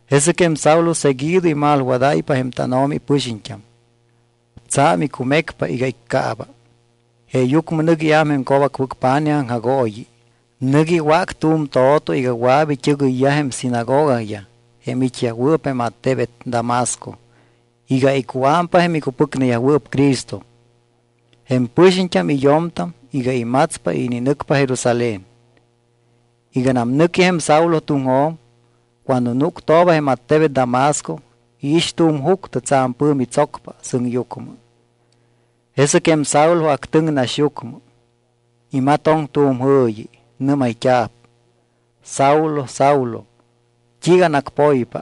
Jesɨc jém Saulo seguido imalwadáypa jém tánO̱mi ipɨxiñt́am. Tsa̱m icumecpa iga iccaaba. Jeeyucmɨ nɨc iám jém co̱bacpɨc pa̱nij aŋjagooyi. Nɨc iwác tu̱m to̱to iga wɨa̱p it́ɨgɨyyaj jém sinagogayaj jém it́yajwɨɨp jém attebet Damasco iga icuámpa jém icupɨcneyajwɨɨp Cristo, jém pɨxiñt́am y yo̱mtam iga imatspa y ininɨcpa Jerusalén. Iganam nɨqui jém Saulo tuŋjo̱m, cuando núctooba jém attebet Damasco, iix tu̱m juctɨ tsa̱m pɨ̱mi tsocpa sɨŋyucmɨ. Jesɨc jém Saulo actɨŋ naxyucmɨ. Imatoŋ tu̱m jɨ̱yi. Nɨ́mayt́a̱p: —Saulo, Saulo, ¿t́iiga anacpoypa?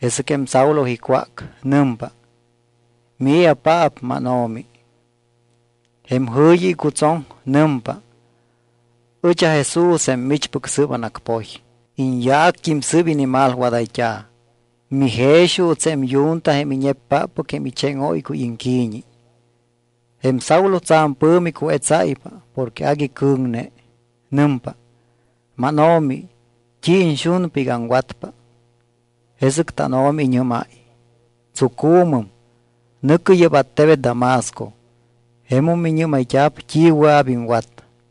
Jesɨc jém Saulo icwác. Nɨmpa: —¿Mii̱apaap, mánO̱mi? Jém jɨ̱yi icutsoŋ. Nɨmpa: —Ɨch aJesús jém michpɨc sɨɨp anacpoy. Iñyaact́im sɨɨp inimalwadayt́a̱. Mijex juuts jém yunta jém iñeppáppɨc jém icheŋóycuy iŋqui̱ñi. Jém Saulo tsa̱m pɨ̱mi cuetsáypa porque agui cɨ̱ŋne. Nɨmpa: —¿MánO̱mi, t́i iñxunpa iga aŋwatpa? Jesɨc tánO̱mi iñɨ́máy: —Tsucu̱mɨm, nɨ̱cɨ yɨ́p attebet Damasco. Jemum miñɨ́mayt́a̱p t́i wɨa̱p iŋwat.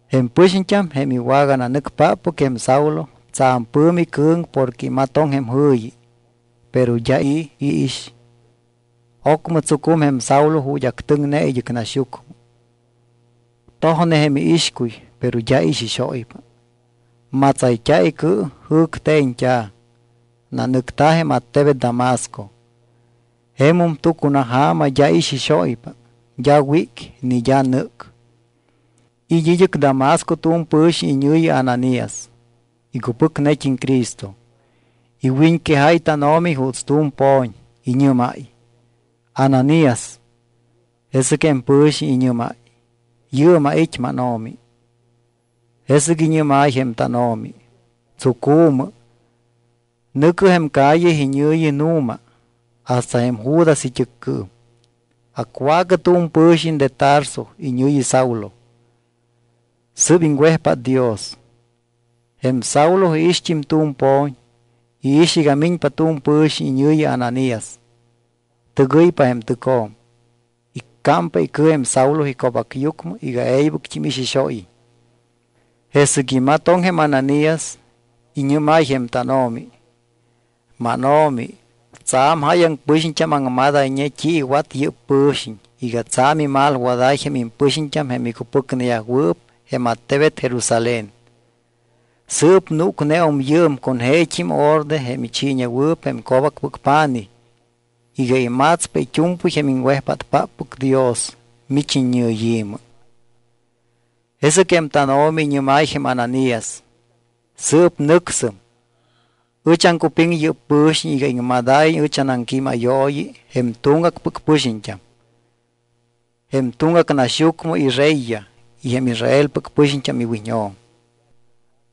Jém pɨxiñt́am, jém iwagananɨcpáppɨc jém Saulo, tsa̱m pɨ̱mi cɨ̱ŋ porque imatoŋ jém jɨ̱yi, pero d́a i̱ iix. Ocmɨ tsucum jém Saulo ju̱t́ actɨŋne id́ɨc naxyucmɨ. Tojne jém iixcuy, pero d́a ixixóypa. Matsayt́a̱ icɨ, jɨ̱cte̱ñt́a̱. Nanɨcta̱ jém attebet Damasco. Jemum tucunaja̱ma d́a ixixóypa. D́a wíc ni d́a nɨ́c. It́ id́ɨc Damasco tu̱m pɨ̱xiñ iñɨ̱yi Ananías, icupɨcnet́im Cristo. Iwiñquejáy tánO̱mi juuts tu̱m po̱ñ. Iñɨ́máy: —¡Ananías! Jesɨc jém pɨ̱xiñ iñɨ́máy: —Yɨɨm ait́, mánO̱mi. Jesɨc iñɨ́máy jém tánO̱mi: —Tsucu̱mɨ. Nɨ̱cɨ jém calle iñɨ̱yi Nu̱ma, hasta jém Judas it́ɨccɨɨm. Acwaacɨ tu̱m pɨ̱xiñ de Tarso iñɨ̱yi Saulo, sɨ́p iŋwejpát Dios. Jém Saulo iixt́im tu̱m po̱ñ. Iix iga miñpa tu̱m pɨ̱xiñ iñɨ̱yi Ananías, tɨgɨypa jém tɨcjo̱m, iccámpa icɨ jém Saulo ico̱bacyucmɨ iga e̱ybɨct́im ixixóyiñ. Jesɨc imatoŋ jém Ananías, iñɨ́máy jém tánO̱mi: —MánO̱mi, tsa̱m jáyaŋ pɨxiñt́am aŋmadayñe t́i iwat yɨ́p pɨ̱xiñ iga tsa̱m imalwadáy jém impɨxiñt́am jém micupɨcneyajwɨɨp jém attebet Jerusalén. Sɨɨp núcneum yɨɨm con jeet́im orde jém ichiiñewɨɨp jém co̱bacpɨc pa̱nij iga imatspa it́u̱mpɨy jém iŋwejpátpáppɨc Dios mich iñɨyi̱mɨ. Jesɨc jém tánO̱mi iñɨ́máy jém Ananías: —Sɨɨp nɨcsɨm. Ɨch aŋcupiŋ yɨ́p pɨ̱xiñ iga iŋmadáyiñ ɨch anaŋquímayooyi jém tuŋgacpɨc pɨxiñt́am, jém tuŋgac naxyucmɨ ireyyaj y jém Israelpɨc pɨxiñt́am iwiñjo̱m.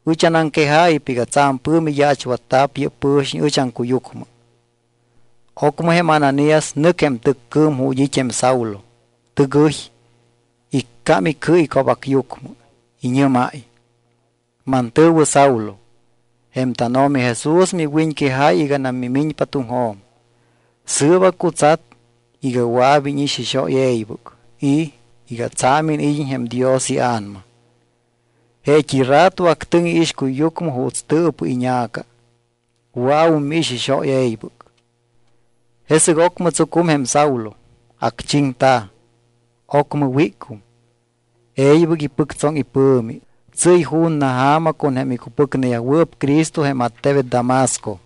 Ɨch anaŋquejáypa iga tsa̱m pɨ̱mi yaachwatta̱p yɨ́p pɨ̱xiñ ɨch aŋcuyucmɨ. Ocmɨ jém Ananías nɨc jém tɨccɨɨm ju̱t́ it́ jém Saulo. Tɨgɨy, iccám icɨ ico̱bacyucmɨ. Iñɨ́máy: —Mantɨ̱wɨ Saulo, jém tánO̱mi Jesús miwiñquejáy iganam mimiñpa tuŋjo̱m. Sɨɨp acutsat iga wɨa̱p íñixixóy e̱ybɨc y iga tsa̱m iniid́iñ jém Dios iA̱nama. Jeet́i rato actɨŋ iixcuyyucmɨ juuts tɨɨpɨ iña̱ca, wɨa̱wum miixixóy e̱ybɨc. Jesɨc ocmɨ tsucum jém Saulo, acchiŋta̱. Ocmɨ wícum, e̱ybɨc ipɨctsoŋ ipɨ̱mi. Tsɨ́y ju̱na ja̱ma con jém icupɨcneyajwɨɨp Cristo jém attebet Damasco.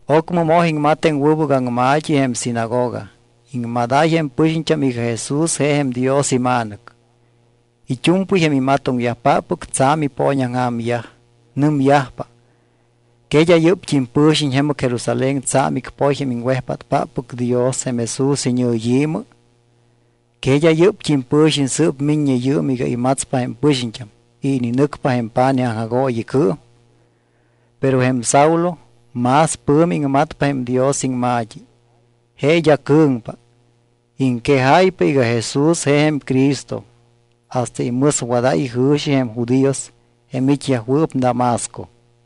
Ocmɨ moj iŋmat jém wɨbɨc aŋma̱t́i jém sinagoga. Iŋmadáy jém pɨxiñt́am iga Jesús je jém Dios iMa̱nɨc. It́u̱mpɨy jém imatoŋyajpáppɨc tsa̱m ipooñaŋja̱myaj. Nɨmyajpa: —¿Que d́a yɨ́pt́im pɨ̱xiñ jemɨc Jerusalén tsa̱m icpoy jém iŋwejpátpáppɨc Dios jém Jesús iñɨyi̱mɨ? ¿Que d́a yɨ́pt́im pɨ̱xiñ sɨ́p miññe yɨɨm iga imatspa jém pɨxiñt́am y ininɨcpa jém pa̱nij aŋjagooyicɨɨm? Pero jém Saulo más pɨ̱mi iŋmatpa jém Dios iŋma̱t́i. Je d́a cɨ̱ŋpa. Iŋquejáypa iga Jesús je jém Cristo hasta imɨswadáy ijɨ̱xi jém judíos jém it́yajwɨɨp Damasco.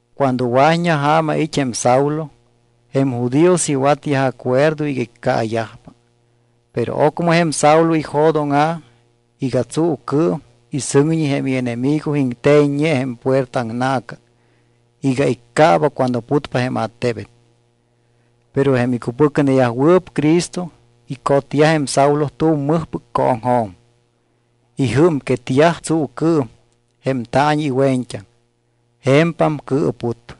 Cuando wa̱t́ña ja̱ma it́ jém Saulo, jém judíos iwatyaj acuerdo iga iccaayajpa. Pero ocmɨ jém Saulo ijo̱dóŋa̱ iga tsuucɨɨm y sɨŋñi jém ienemigo iŋte̱ññe jém puerta aŋna̱ca iga iccaaba cuando putpa jém attebet. Pero jém icupɨcneyajwɨɨp Cristo icotyaj jém Saulo tu̱m mɨjpɨc cooŋjo̱m. Ijɨ́mquetyaj tsuucɨɨm jém taañi iwe̱ñt́aŋ. Je̱mpam cɨɨput.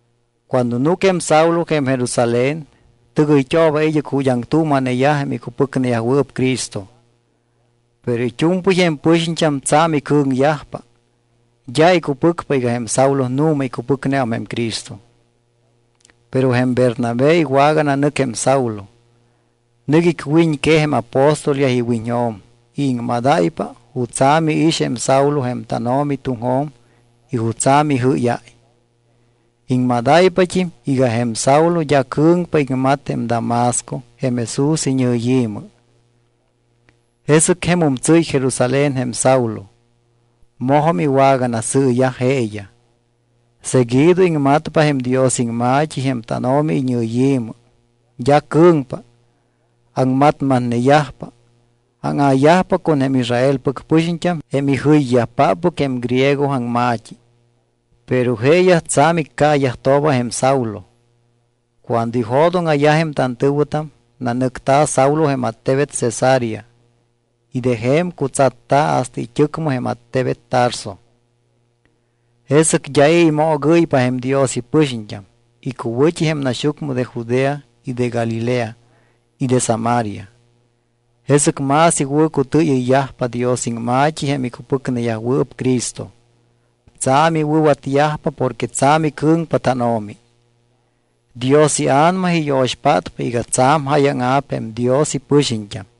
Cuando núc jém Saulo jém Jerusalén, tɨgɨyt́ooba id́ɨc ju̱t́ aŋtuuma̱neyaj jém icupɨcneyajwɨɨp Cristo. Pero it́u̱mpɨy jém pɨxiñt́am tsa̱m icɨ̱ŋyajpa. D́a icupɨcpa iga jém Saulo nu̱ma icupɨcneum jém Cristo. Pero jém Bernabé iwagananɨc jém Saulo. Nɨc icwiñquej jém apóstolyaj iwiñjo̱m y iŋmadáypa jutsa̱ miix jém Saulo jém tánO̱mi tuŋjo̱m y jutsa̱ mijɨ́yáy. Iŋmadáypat́im iga jém Saulo d́a cɨ̱ŋpa iŋmat jém Damasco jém Jesús iñɨyi̱mɨ. Jesɨc jemum tsɨ́y Jerusalén jém Saulo. Mojum iwaganasɨɨyaj jeeyaj. Seguido iŋmatpa jém Dios iŋma̱t́i jém tánO̱mi iñɨyi̱mɨ. D́a cɨ̱ŋpa. Aŋmatmatneyajpa, áŋa̱yajpa con jém Israelpɨc pɨxiñt́am jém ijɨyyajpáppɨc jém griego aŋma̱t́i. Pero jeeyaj tsa̱m iccaayajtooba jém Saulo. Cuando ijo̱dóŋa̱yaj jém tantɨ̱wɨtam, nanɨcta̱ Saulo jém attebet Cesarea y de je̱m cutsatta̱ hasta it́ɨcmɨ jém attebet Tarso. Jesɨc d́a i̱ imoogɨ́ypa jém Dios ipɨxiñt́am icuwɨ̱t́i jém naxyucmɨ de Judea y de Galilea y de Samaria. Jesɨc más iwɨ̱cutɨɨyɨyyajpa Dios iŋma̱t́i jém icupɨcneyajwɨɨp Cristo. Tsa̱m iwɨ̱watyajpa porque tsa̱m icɨ̱ŋpa tánO̱mi. Dios iA̱nama iyo̱xpátpa iga tsa̱m jáyaŋa̱p jém Dios ipɨxiñt́am.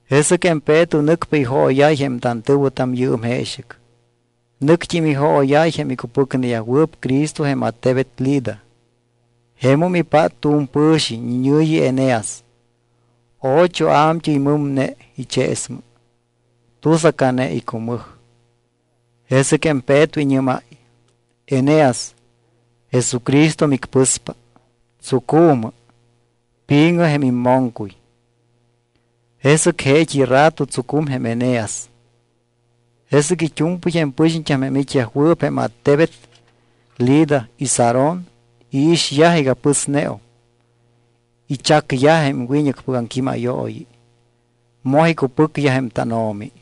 Jesɨc jém Peto nɨcpa ijooyáy jém tantɨ̱wɨtam yɨɨm jeexɨc. Nɨct́im ijooyáy jém icupɨcneyajwɨɨp Cristo jém attebet Lida. Jemum ipát tu̱m pɨ̱xiñ iñɨ̱yi Eneas. Ocho a̱mt́ɨy mɨmne icheesmɨ. Tusacane icumɨj. Jesɨc jém Peto iñɨ́máy: —Eneas, Jesucristo micpɨspa. Tsucu̱mɨ. Pi̱ŋɨ jém immoŋcuy. Jesɨc jeet́i rato tsucum jém Eneas. Jesɨc it́u̱mpɨy jém pɨxiñt́am jém it́yajwɨɨp jém attebet Lida y Sarón iixyaj iga pɨsneum. Ichacyaj jém wiñɨcpɨc aŋquímayooyi, moj icupɨcyaj jém tánO̱mi.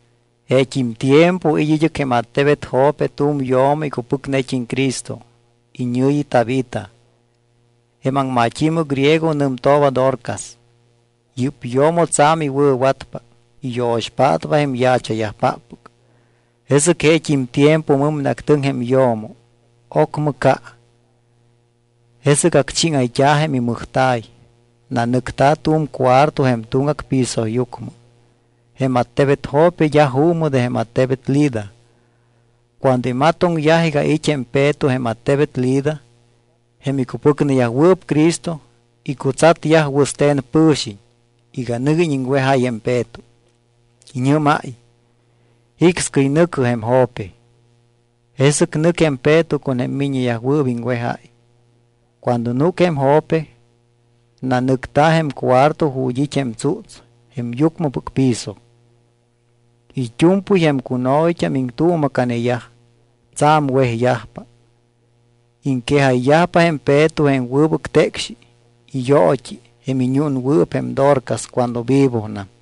Jeet́im tiempo it́ id́ɨc jém attebet Jope tu̱m yo̱mo icupɨcnet́im Cristo. Iñɨ̱yi Tabita. Jém aŋmat́i̱mɨ griego nɨmtooba Dorcas. Yɨ́p yo̱mo tsa̱m iwɨ̱watpa, iyo̱xpátpa jém yaacha̱yajpáppɨc. Jesɨc jeet́im tiempo mɨmneactɨŋ jém yo̱mo, ocmɨ ca. Jesɨc acchíŋayt́a̱ jém imɨjta̱y. Nanɨcta̱ tu̱m cuarto jém tuŋgac pisoyucmɨ. Jém attebet Jope d́a juumɨ de jém attebet Lida. Cuando imatoŋyaj iga it́ jém Peto jém attebet Lida, jém icupɨcneyajwɨɨp Cristo icutsatyaj wɨste̱n pɨ̱xiñ iga nɨguiñ iŋwejáy jém Peto. Iñɨ́máy: —Jicscɨy nɨ̱cɨ jém Jope. Jesɨc nɨc jém Peto con jém miññeyajwɨɨp iŋwejáy. Cuando núc jém Jope, nanɨcta̱ jém cuarto ju̱t́ it́ jém tsúts jém yucmɨpɨc piso. It́u̱mpɨy jém cuno̱yt́am iŋtuuma̱caneyaj. Tsa̱m wejyajpa. Iŋquejayyajpa jém Peto jém wɨbɨc tecxi y yoot́i jém iñúnwɨɨp jém Dorcas cuando vivonam.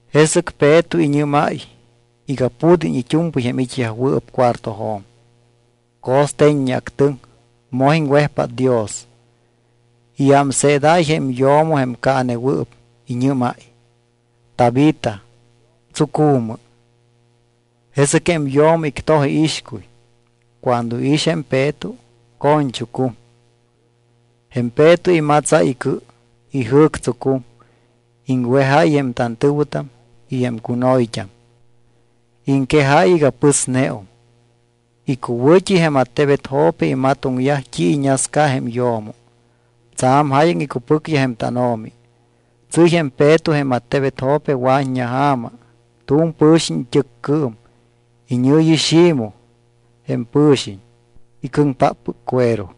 Jesɨc Peto iñɨ́máy iga pud́iñ it́u̱mpɨy jém it́yajwɨɨp cuartojo̱m. Co̱ste̱ññeactɨŋ, moj iŋwejpát Dios. Iámseedáy jém yo̱mo jém caanewɨɨp, iñɨ́máy: —Tabita, tsucu̱mɨ. Jesɨc jém yo̱mo ictoj iixcuy. Cuando iix jém Peto, co̱ñchucum. Jém Peto imatsáy icɨ, ijɨ̱ctsucum. Iŋwejáy jém tantɨ̱wɨtam y jém cuno̱yt́am. Iŋquejáy iga pɨsneum. Icuwɨ̱t́i jém attebet Jope imatoŋyaj t́i iñasca jém yo̱mo. Tsa̱m jáyaŋ icupɨcyaj jém tánO̱mi. Tsɨ́y jém Peto jém attebet Jope wa̱t́ña ja̱ma tu̱m pɨ̱xiñ it́ɨccɨɨm. Iñɨ̱yi Ximoj jém pɨ̱xiñ, icɨŋpáppɨc cuero.